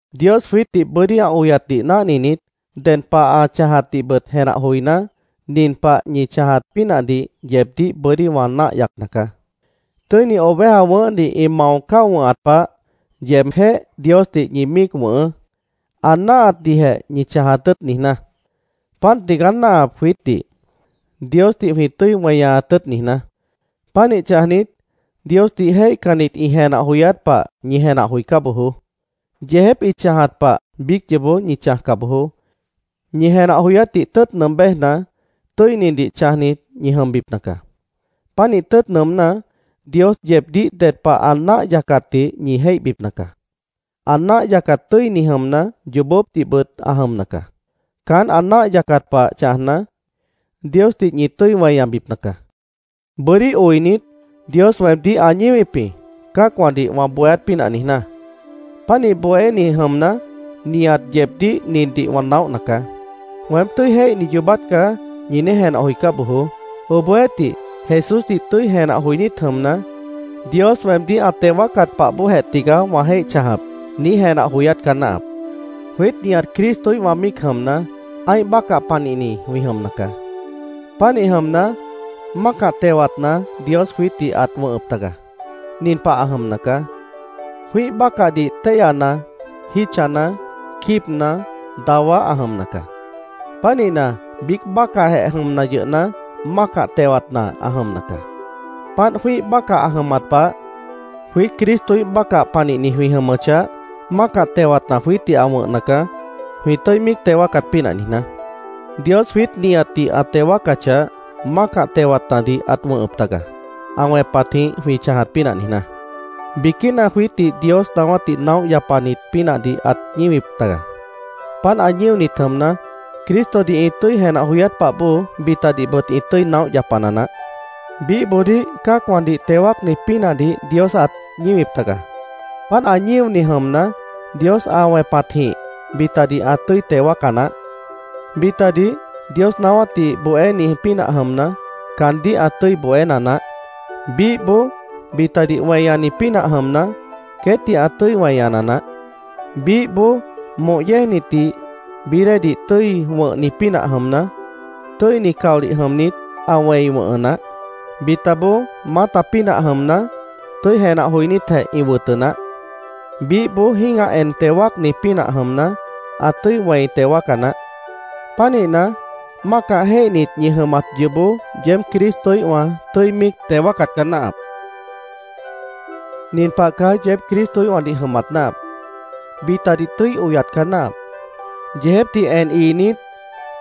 Dios jwiítdih bʉ́dí ã oyatdih náhninit, ded pah ã chãjatdihbʉt jenah joiná, nin pah ñi chãjat pínahdih yeebdíh bʉ́dí wã náah yacna caá: Tʉ́ini oveja wʉ̃ʉ́hdih ĩ mao cáo wʉ̃hat pah, yeebjéh Diosdih ñi míic wʉ̃hʉʉ́, ã náahatdihjeh ñi chãjat tʉ́ʉt niijná. Páant tigaá náahap jwiítdih, Diosdih jwĩ tʉ́i weñaat tʉ́ʉt niijná. Pánih chãjnit, Diosdih jéihcannit ĩ jenah joyát pah ñi jenah joicá bojoó. Yeejép ĩ chãjat pah biíc yoobó ñi chãjca bojoó. Ñi jenah joyátdih tʉ́ʉt nʉʉm béjna, tʉ́inidih chãjnit ñi jʉmbipna caá. Pánih tʉ́ʉt nʉʉmná, Dios yeebdíh ded pah ã náah yacatdih ñi jéihbipna caá. Ã náah yacat tʉ́ini jʉmna, yoobópdihbʉt ã jʉmna caá. Caán ã náah yacat pah chãjna, Diosdih ñi tʉ́i weñabipna caá. Bʉ́dí oinit, Dios weemdíh ã ñíwip jĩ, cã́acwãdih wã bohéát pínah niijná. Pánih bohéni jʉmna, nihat yeebdíh nindih wã naóhna caá: “Weém tʉ́i jéihni yoobát caá”, ñi niíj jenah joicá bojoó. Obohjeéhtih, Jesúsdih tʉ́i jenah joinít jʉmna, “Dios weemdíh ã teo wáacat pah bóojeh tigaá wã jéih chãjap”, niíj jenah joyát caá náahap. Jwiít nihat Cristoíhwã míic jʉmna, ã́ih bácah panihni jwĩ jʉmna caá. Pánih jʉmna, mácah tewatna Dios jwiítdih ãt wʉ̃hʉp taga. Nin pah ã jʉmna caá: Jwĩ́ih bácahdih téihyana, jítchana, quíibna, dawá ã jʉmna caá. Pánihna, biíc bácahjeh jʉmna yʉhna, mácah tewatna ã jʉmna caá. Páant jwĩ́ih bácah ã jʉmat pah, jwiít Cristoíh bácah panihni jwĩ jʉmʉchah, mácah tewatna jwiítdih ã wʉ̃hna caá, jwĩ tʉ́i míic teo wáacat pínah niijná. Dios jwiít nihatdih ã teo wáacachah, mácah tewatnadih ãt wʉ̃hʉp taga, ã wẽpatjĩh jwĩ chãjat pínah niijná. Biquína jwiítdih Dios naáwátdih naóh yapanit pínahdih ãt ñíwip taga. Páant ã ñíonit jʉmna, Cristodih ĩ tʉ́i jenah joyát pah bóo bitadihbʉt ĩ tʉ́i naóh yapana naáh. Biíhboodíh cã́acwãdih teo wáacni pínahdih Dios ãt ñíwip taga. Páant ã ñíoni jʉmna, Dios ã wẽpatjĩh bitadih ã tʉ́i teo wáaca naáh. Bitadih Dios naáwátdih bohéni pínah jʉmna, caandíh ã tʉ́i bohéna naáh. Biíhboó bitadih weñani pínah jʉmna, queétdih ã tʉ́i weñana naáh. Biíhboó, moh yéejnitdih bií déedih tʉ́i wʉ̃hni pínah jʉmna, tʉ́ini caolih jʉmnit, ã wẽi wʉ̃hʉ naáh. Bitaboó maáta pínah jʉmna, tʉ́i jenah joinítjeh ĩ wʉtʉ naáh. Biíhboó jĩ́gah en teo wáacni pínah jʉmna, ã tʉ́i wẽi teo wáaca naáh. Pánihna, mácah jéihnit ñi jʉmat yoobó yeéb Cristoíhwã tʉ́i míic teo wáacat caá náahap. Nin pah caá yeéb Cristoíhwãdih jʉmat náahap: Bitadih tʉ́i oyat caá náahap. Yeejépdih en iinít,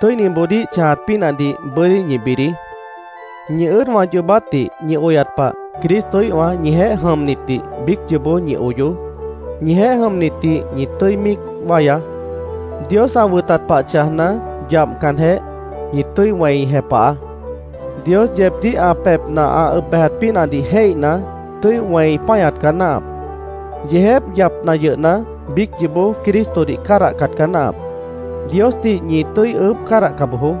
tʉ́iniboodíh chãjat pínahdih bʉ́dí ñi bidií. Ñi ʉ́ʉdwã yoobátdih ñi oyat pah Cristoíhwã ñijeéh jʉmnitdih biíc yoobó ñi oyoó. Ñijeéh jʉmnitdih ñi tʉ́i míic wáyaá. Dios ã wʉtat pah chãjna, yabhcanjeh, ñi tʉ́i wẽi jepahaá. Dios yeebdíh ã pebhna ã ʉb bejat pínahdih jéihna, tʉ́i wẽi páñat caá náahap. Yeejép yapna yʉhna, biíc yoobó Cristodih cádahcat caá náahap. Diosdih ñi tʉ́i ʉʉ́bh cádahca bojoó.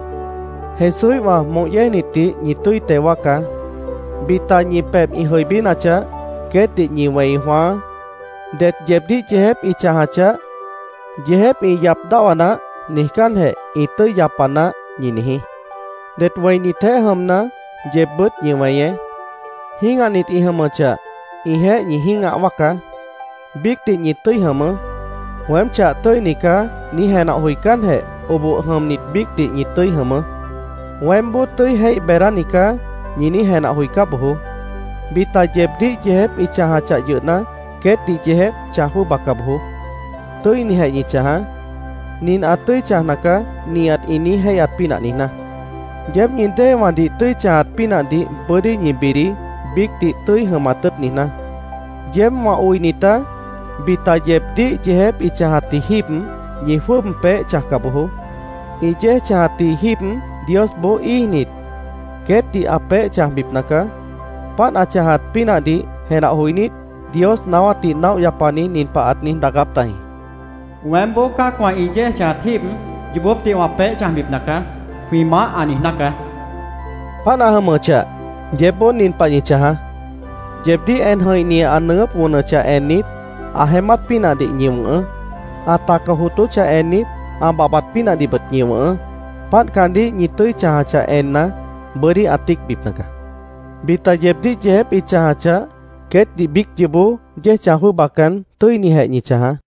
Jesúíhwã moh yéejnitdih ñi tʉ́i teo wáacá. Bita ñi pebh ĩ jʉibínachah, queétdih ñi wẽi jwãáá. Det yeebdíh yeejép ĩ chãjachah, “Yeejép ĩ yap dáhwa naáh”, niijcánjeh, “Ĩ tʉ́i yapa naáh”, ñi niijí. Det wẽinitjeéh jʉmna, yeebbʉ́t ñi weñeé. Jĩ́gahnit ĩ jʉmʉchah, ĩjeéh ñi jĩ́gah wáacá. Biícdih ñi tʉ́i jʉmʉʉ́. “Weém chah tʉ́ini caá”, niíj jenah joicánjeh, oboh jʉmnit biícdih ñi tʉ́i jʉmʉʉ́. “Weémboó tʉ́i jéih beedáni caá”, ñi niíj jenah joicá bojoó. Bita yeebdíh yeejép ĩ chãjachah yʉhna, queétdih yeejép chãj jwʉ́ʉbaca bojoó. Tʉ́inijeh ñi chãjaá, “Nin ã tʉ́i chãjna caá”, nihat ĩ niíj jéihyat pínah niijná. Yeéb ñi déewãdih tʉ́i chãjat pínahdih bʉ́dí ñi bidií, biícdih tʉ́i jʉmat tʉ́ʉt niijná. Yeéb, wã oinitá, bita yeebdíh yeejép ĩ chãjatji jíib, ñi jwʉ́ʉb peéh chãjca bojoó. Ĩ yéej chãjatji jíib, Diosboó íijnit, queétdih ã peéh chãjbipna caá. Páant ã chãjat pínahdih jenah joinít, Dios naáwátdih naóh yapani nin pah ãt niíj daacáp tajĩ: “ ‘Weémboó cã́acwã ĩ yéej chãjat jíib yoobópdih wã peéh chãjbipna caá’, jwĩ Maáh ã niijná caá”, ãt niíj daacáp tajĩ. Páant ã jʉmʉchah, yeébboó nin pah ñi chãjaá: Yeebdíh en jʉ̃ihni ã nʉʉgʉ́p wʉnʉchah ennit, ã jeémát pínahdih ñi wʉ̃hʉʉ́. Ã taca jootóchah ennit, ã babhbat pínahdihbʉt ñi wʉ̃hʉʉ́. Páant caandíh ñi tʉ́i chãjachah enna, bʉ́dí ã tíicbipna caá. Bita yeebdíh yeejép ĩ chãjachah, queétdih biíc yoobó yéej chãj jwʉ́ʉbacan, tʉ́inijeh ñi chãjaá.